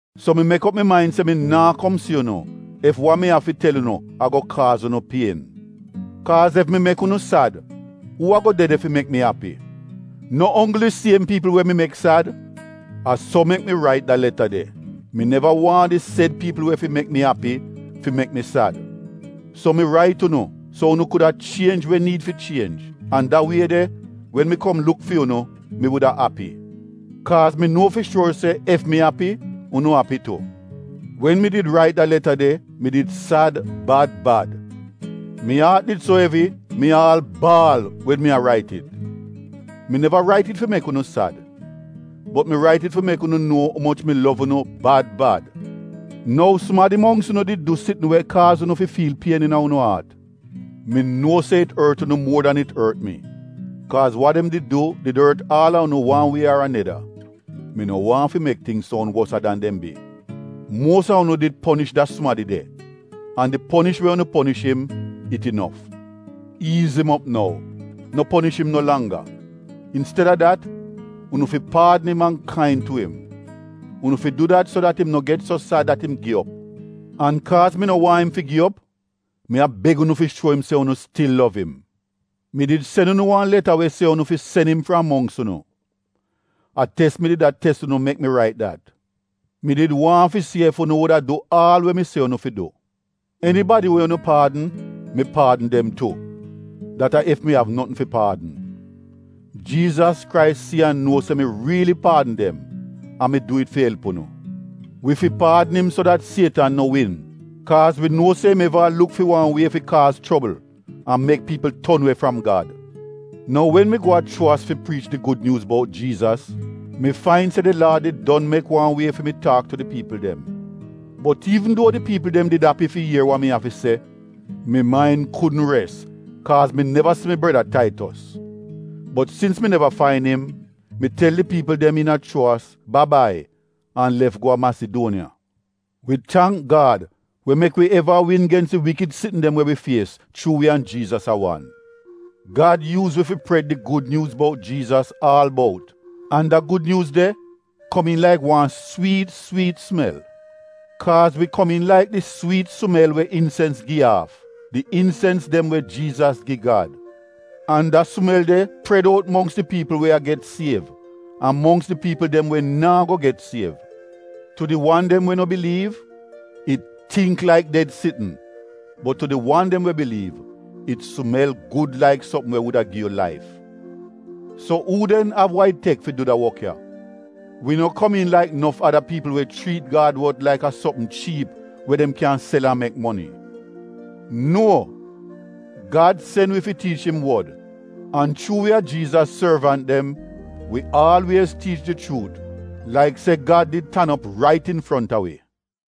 So mi mek op mi main se mi naa kom si unu ef wa mi av fi tel unu a-go kaaz unu pien. Kaaz ef mi mek unu sad, uu a-go de de fi mek mi api? No onggl di siem piipl we mi mek sad? A so mek mi rait da leta de — mi neva waahn di sed piipl we fi mek mi api, fi mek mi sad. So mi rait unu so unu kuda chienj we niid fi chienj, an da wie de wen mi kom luk fi unu, mi wuda api. Kaaz mi nuo fi shuor se ef mi api unu api tu. Wen mi did rait da leta de mi did sad bad bad. Mi aat did so evi mi aal baal wen mi a rait it. Mi neva rait it fi mek unu sad, bot mi rait it fi mek unu nuo umoch mi lov unu bad bad. Nou sumadi mongks unu did du sitn we kaaz unu fi fiil pien iina unu aat. Mi nuo se it ort unu muor dan it ort mi kaaz wa dem did du did ort aal a unu wan wie ar aneda (mi no waahn fi mek tingz soun wosa dan dem bi). Muos a unu did ponish da sumadi de an di ponish we unu ponish im, it inof. Iiz im op nou, no ponish im no langga. Insted-a dat unu fi paadn im an kain tu im. Unu fi du dat so dat im no get so sad dat im gi op. An kaaz mi no waahn im fi gi op, mi a beg unu fi shuo im se unu stil lov im. Mi did sen unu wan leta we se unu fi sen im fram mongks unu. A tes mi did a tes unu mek mi rait dat. Mi did waahn fi si ef unu wuda du aal we mi se unu fi du. Enibadi we unu paadn, mi paadn dem tu (dat a ef mi av notn fi paadn). Jiizas Krais si an nuo se mi riili paadn dem an mi du it fi elp unu. Wi fi paadn im so dat Sietan no win kaaz wi nuo se im eva a luk fi wan wie fi kaaz chobl an mek piipl ton we fram Gad. Nou wen mi go a Chuowas fi priich di Gud Nyuuz bout Jiizas, mi fain se di Laad did don mek wan wie fi mi taak tu di piipl dem. Bot iivn duo di piipl dem did api fi ier wa mi av fi se, mi main kudn res, kaaz mi neva si mi breda Taitos. Bot sins mi neva fain im, mi tel di piipl dem iina Chuowas ba-bai an lef go a Masiduoniya. Wi tangk Gad we mek wi eva a win gens di wikid sitn dem we wi fies, chuu wi an Jiizas a wan. Gad yuuz wi fi pred di Gud Nyuuz bout Jiizas aal bout, an da Gud Nyuuz de komiin laik wan swiit swiit sumel. Kaaz wi komiin laik di swiit sumel we insens gi aaf — di insens dem we Jiizas gi Gad. An da sumel de pred out mongks di piipl we a get siev an mongks di piipl dem we naa go get siev. Tu di wan dem we no biliiv, it tingk laik ded sitn bot tu di wan dem we biliiv, it sumel gud laik sopm we wuda gi yu laif. So uu den av wa it tek fi du da wok ya? Wi no komiin laik nof ada piipl we chriit Gad wod laik a sopm chiip we dem kyan sel an mek moni. Nuo! Gad sen wi fi tiich im Wod an chuu wi a Jiizas sorvant dem wi aalwiez tiich di chuut laik se Gad did tan op rait infronta wi.